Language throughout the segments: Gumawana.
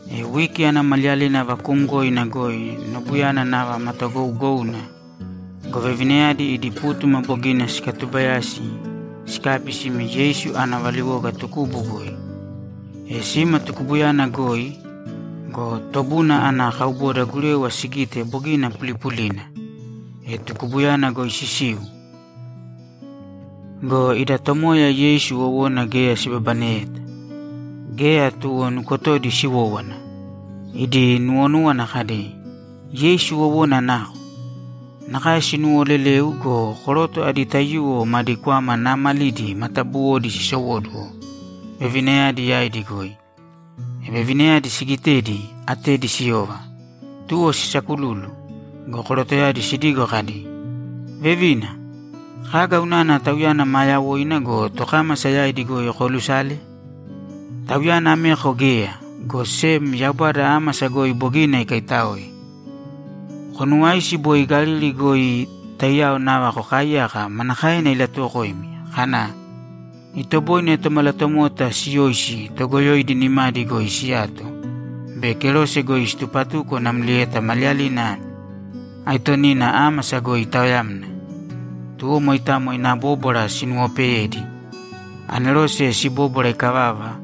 E wiki ana maliyalina vakuumgoina goi nobuyana nava matagougouna go, vevinayadi idi pútuma bogina sikatuubayasi sikabi sime Yeisu ana valiwoga tukubu goi. E sima tukubuyana goi go, tobuna ana kauboda gurewa sigite, bogina pulipulina! E tukubuyana goi sisiu go, ida Tomoya Yeisu wowona geya sibabaneyeta. Geya tuwo nukotodi siwówana, idi nuwonúwana kadi, ‘Yeisu wowona nako?’ Nakae sinuwooleleu go, koroto adi taiyuwo madi kwama naamalidi matabuwodi sisowóduwo vevinayadi yaidi goi. E vevinayadi sigitedi, atedi siyova, tuwo sisakululu go, korotoyadi sidigo kadi, ‘Vevina, kaga unana Tauyana maa yawoina go, tokámasa yaidi goi koolusale? Tauyana ameko geya, go sem Yaubada ámasa goi bogina ikaitáoe. Konuwāisi boi Galili goi taiyao nava kokaaiyaka manakaena ilatuwokoimi kana, “Itoboine Tomalatomota siyoisi toogoyoidi nimadi goi siyato be kerose goi situpatuko namlieta maliyalina aitonina ámasa goi itaoyamna.”’ Tuwo moitamo ina bóbwara sinuwopeyedi. Anerose sibóbwara ikavava,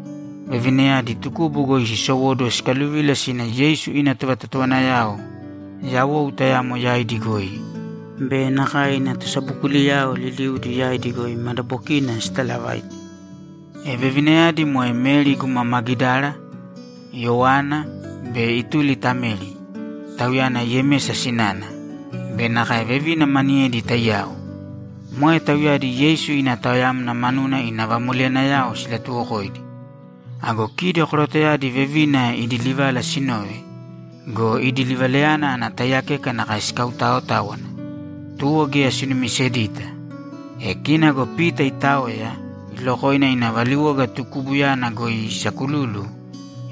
vevinayadi tukubu goi sisowóduwo sikaluvila sina Yeisu ina tovatotowanayao yawou tayamo yaidi goi be nakae ina tosabokuliyao liliudi yaidi goi madabokina sitalavaite. E vevinayadi moe Meri guma Magidara, Yoana be ituli ta Meri, tauyana Yemesa sinana, be nakae vevina maniyedi taiyao. Moe tauyadi Yeisu ina taoyamna manuna ina vamoleyanayao silatuwokoidi. Ago kidi korotoyadi vevina idi livala sinove go, idi livalayana ana taiyakeka nakae sikautaotáwana, tuwo geya sinumisedita. E kina go Pita itaoya, ilokoina ina valiwoga tukubuyana goi isakululu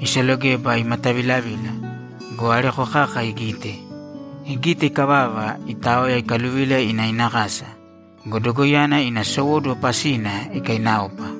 isalogeba imatavilavila go, areko kaka igite. Igite ikavava, itaoya ikaluvila ina ina kasa go, dogoiyana ina sowóduwo pasina ikainaopa.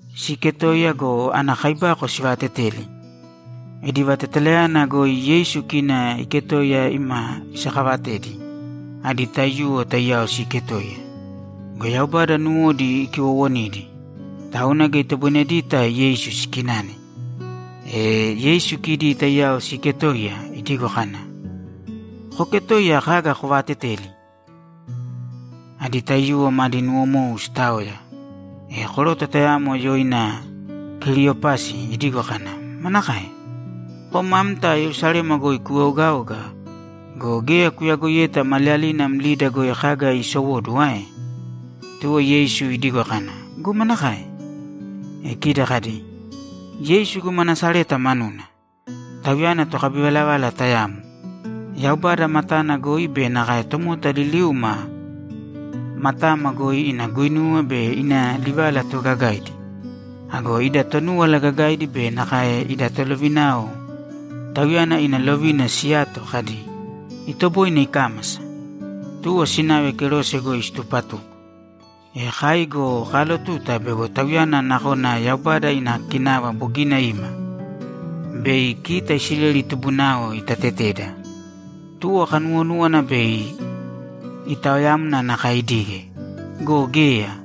Siiketoiya go, ana kaibako sivaateteli. Idi vatetalayana goi Yeisu kina iketoiya ima isakavatedi adi taiyuwo taiyao siiketoiya. Go Yaubada nuwodi ikiwowonidi, tauna geya itoboinedita Yeisu sikinane. E Yeisu kidi taiyao siiketoiya, idigo kana, ‘Kooketoiya kaga kovaateteli?’ Adi taiyuwo madi nuwomou sitaoya. E koroto tayamo yoina Keliyopasi idigo kana, ‘Manakae? Kom amta Yerusalema goi kueogaoga go, geya kuyagoiyeta maliyalina mlida goi kaga siisowóduwo ae?’ Tuwo Yeisu idigo kana, ‘Go manakae?’ E kidi kadi, ‘Yeisu guma Nasareta manuna. Tauyana tokabivalavala tayamo. Yaubada matana goi be nakae tomota liliuma matama goi ina guinuwa be ina livala toogagaidi. Ago ida Tonúwala Gagaidi be nakae ida tolovinayao Tauyana ina lovina siyato kadi, “Itoboine ikámasa.” Tuwo sinave kerose goi situpatuko. E kai go kaalotuta bego Tauyana nakona Yaubada ina kinava bogina ima bei kita Isileli tubunao itateteda. Tuwo kanuwonúwana bei itaoyamna nakae idige, go geya,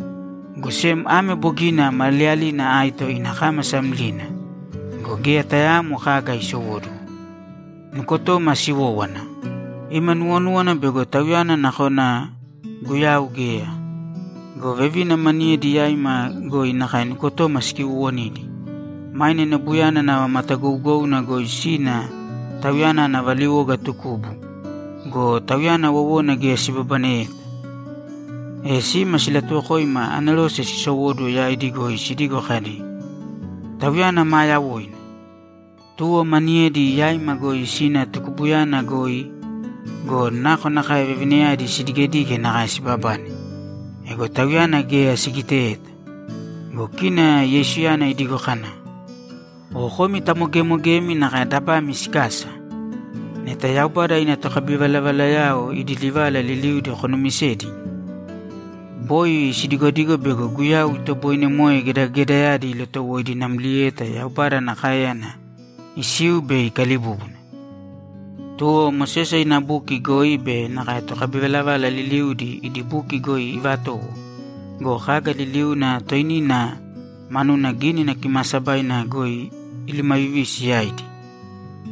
go sem ame bogina maliyalina aito ina kámasa mlina go, geya tayaamo kaga isowóduwo. Nukotoma siwówana; ima nuwonúwana bego Tauyana nakona Guyau geya go, vevina maniyedi yaima goi nakae nukotoma sikiwowonidi. Maine nobuyana nava matagougouna goi sina Tauyana ana valiwoga tukubu go, Tauyana wowona geya sibabaneyeta. E sima silatuwokoima anerose sisowóduwo yaidi goi sidigo kadi, “Tauyana maa yawoina!” Tuwo maniyedi yaima goi sina tukubuyana goi go, nakonakae vevinayadi sidigedige nakae sibabane. Ego Tauyana geya sigiteyeta.’ Go kina Yeisuyana idigo kana, ‘O komi tamogemogemi nakae dabami sikasa! Neta Yaubada ina tokabivalavalayao idi livala liliudi konumisedi! Boi sidigodigo bego Guyau itoboine moe gedagedayadi ilotowoidi namlieta Yaubada ana káeyana isiu bei ikalibúbuna.’ Tuwo Mosese ina buki goi be nakae tokabivalavala liliudi idi buki goi ivatowo go, kaga liliuna toinina manuna Gínina Kimaasabaina goi ilumavivisi yaidi.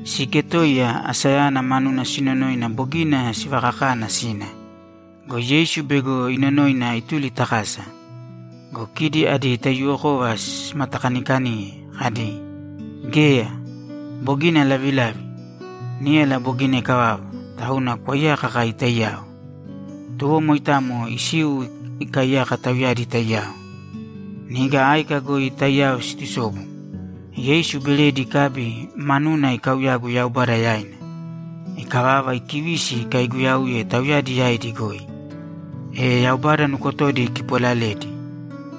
Siiketoiya, asayana manuna sinonoina bogina sivakakana sina go, Yeisu bego inonoina ituli ta kasa. Go kidi adi taiyuwokova simatakanikaniye kadi, ‘Geya. Bogina lavilavi. Níyala bogina ikavava, tauna kwaiyāka kai taiyao.’ Tuwo moitamo isiu ikaiyaka tauyadi taiyao. Niga áika goi taiyao siitusobu, Yeisu beredi ikabi, manuna ikauyagu Yaubada yaina. Ikavava, ikivisi ikaiguyauye tauyadi yaidi goi. E Yaubada nukotodi ikipolaledi,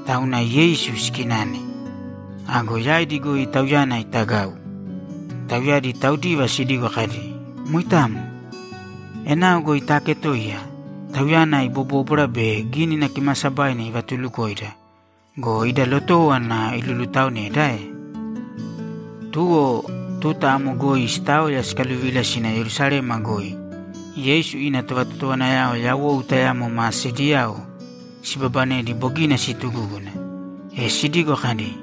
tauna Yeisu sikinane. Ago yaidi goi Tauyana itagau. Tauyadi taudiva sidigo kadi, ‘Moitamo. Enao goi taaketoiya, Tauyana ibobóbwara be Gínina Kimaasabaina ivatulukoida go, ida lotówana ilulutaoneda ae?’ Tuwo tuta amo goi sitaoya sikaluvila sina Yerusalema goi Yeisu ina tovatotowanayao yawou tayamo ma sediyao sibabanedi bogina situgúguna, e sidigo kadi,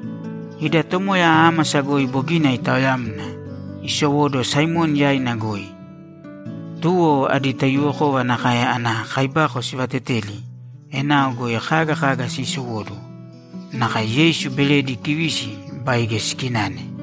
‘Ida Tomoya ámasa goi bogina itaoyamna, isowóduwo Saimoni yaina goi!’ Tuwo adi taiyuwokova nakae ana kaibako sivateteli enao goi kaga kaga siisowóduwo. Nakae Yeisu beredi ikivisi baige sikinane.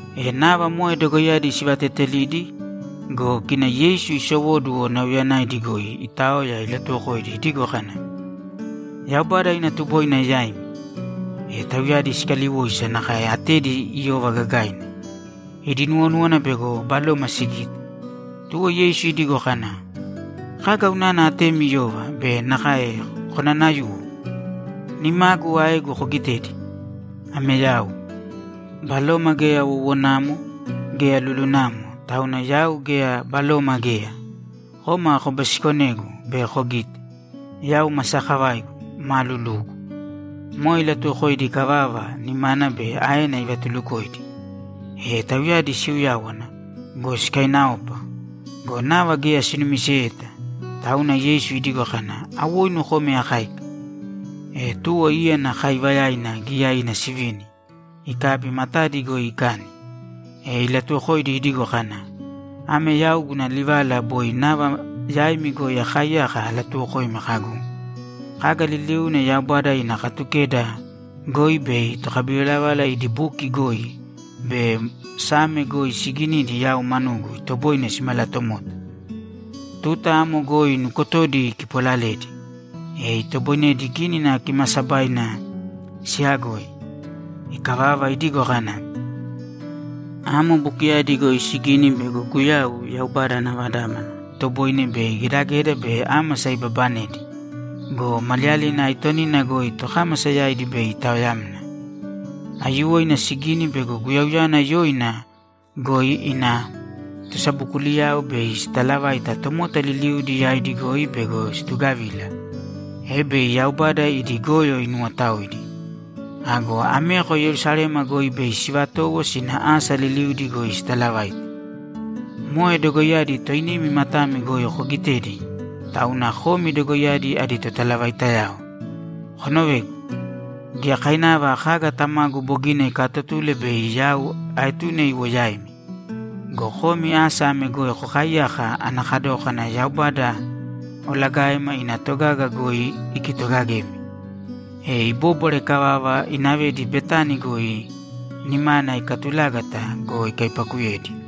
E nava moe dogoiyadi sivateetelidi go, kina Yeisu isowóduwo, nauyayanaidi goi itaoya ilatuwokoidi idigo kana, ‘Yaubada ina tuboina yaimi.’ E tauyadi sikaliwoisa nakae atedi iyova gagaina. Idi nuwonúwana bego baloma sigite. Tuwo Yeisu idigo kana, ‘Kaga unana atemi iyova be nakae konanayuwo? Nimagu aegu kogitēdi. Ame yau. Baloma geya wowonamo, geya lulunamo, tauna yau geya baloma geya. Kōma kobisikonēgu be kogīte, yau ma sakavaigu, ma lulugu.’ Moe ilatuwokoidi ikavava, nimana be aena ivatulukoidi. E tauyadi siuyáwana go, sikainaopa go, nava geya sinumiseyeta. Tauna Yeisu idigo kana, ‘Awoinu kōme akáika.’ E tuwo íyana kaaivayaina giyaina sivini ikabi matadi goi ikani. E ilatuwokoidi idigo kana, ‘Ame yau guna livala boi nava yaimi goi akaaiyaka alatuwokoimi kagu, “Kaga liliuna Yaubada ina Katukeda goi be tokabivalavala idi buki goi be Same goi siiginidi yau manugu itoboine simalatomota.”’ Tuta amo goi nukotodi ikipolaledi, e itoboinedi Gínina Kimaasabaina siyagoi. Ikavava, idigo kana, ‘Amo bukiyadi goi sigini bego Guyau, Yaubada ana Vadámana, itoboine bei gedageda be ámasa ibabanedi go, maliyalina aitonina goi tokámasa yaidi bei itaoyamna. Aiyuwoina sigini bego Guyauyana yoina goi ina tosabokuliyao bei sitalavaita tomota liliudi yaidi goi bego situgavila, e bei Yaubada idi goyo inuwotaoidi. Ago ameko Yerusalema goi bei sivatowo sina asa liliudi goi sitalavaite. Moe dogoiyadi toinimi matami goi kogitedi, tauna komi dogoiyadi adi totalavaitayao. Konovēgu. Giyakainava kaga Tamagu bogina ikaatotule bei yau aetune iwo yaimi. Go komi asa ame goi kokaiyāka ana kadókana Yaubada olagaema ina togaga goi ikitogagemi.’ E ibóbwara ikavava, inavedi Betani goi nimana ikatulágata go, ikaipakuyedi.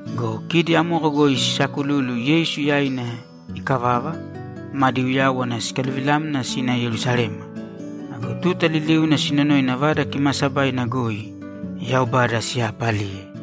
Go kidi amoko goi sisakululu Yeisu yaina ikavava, madi uyáwana sikaluvilamna sina Yerusalema. Ago tuta liliuna sinonoina Vada Kimaasabaina goi Yaubada siyaapaliye.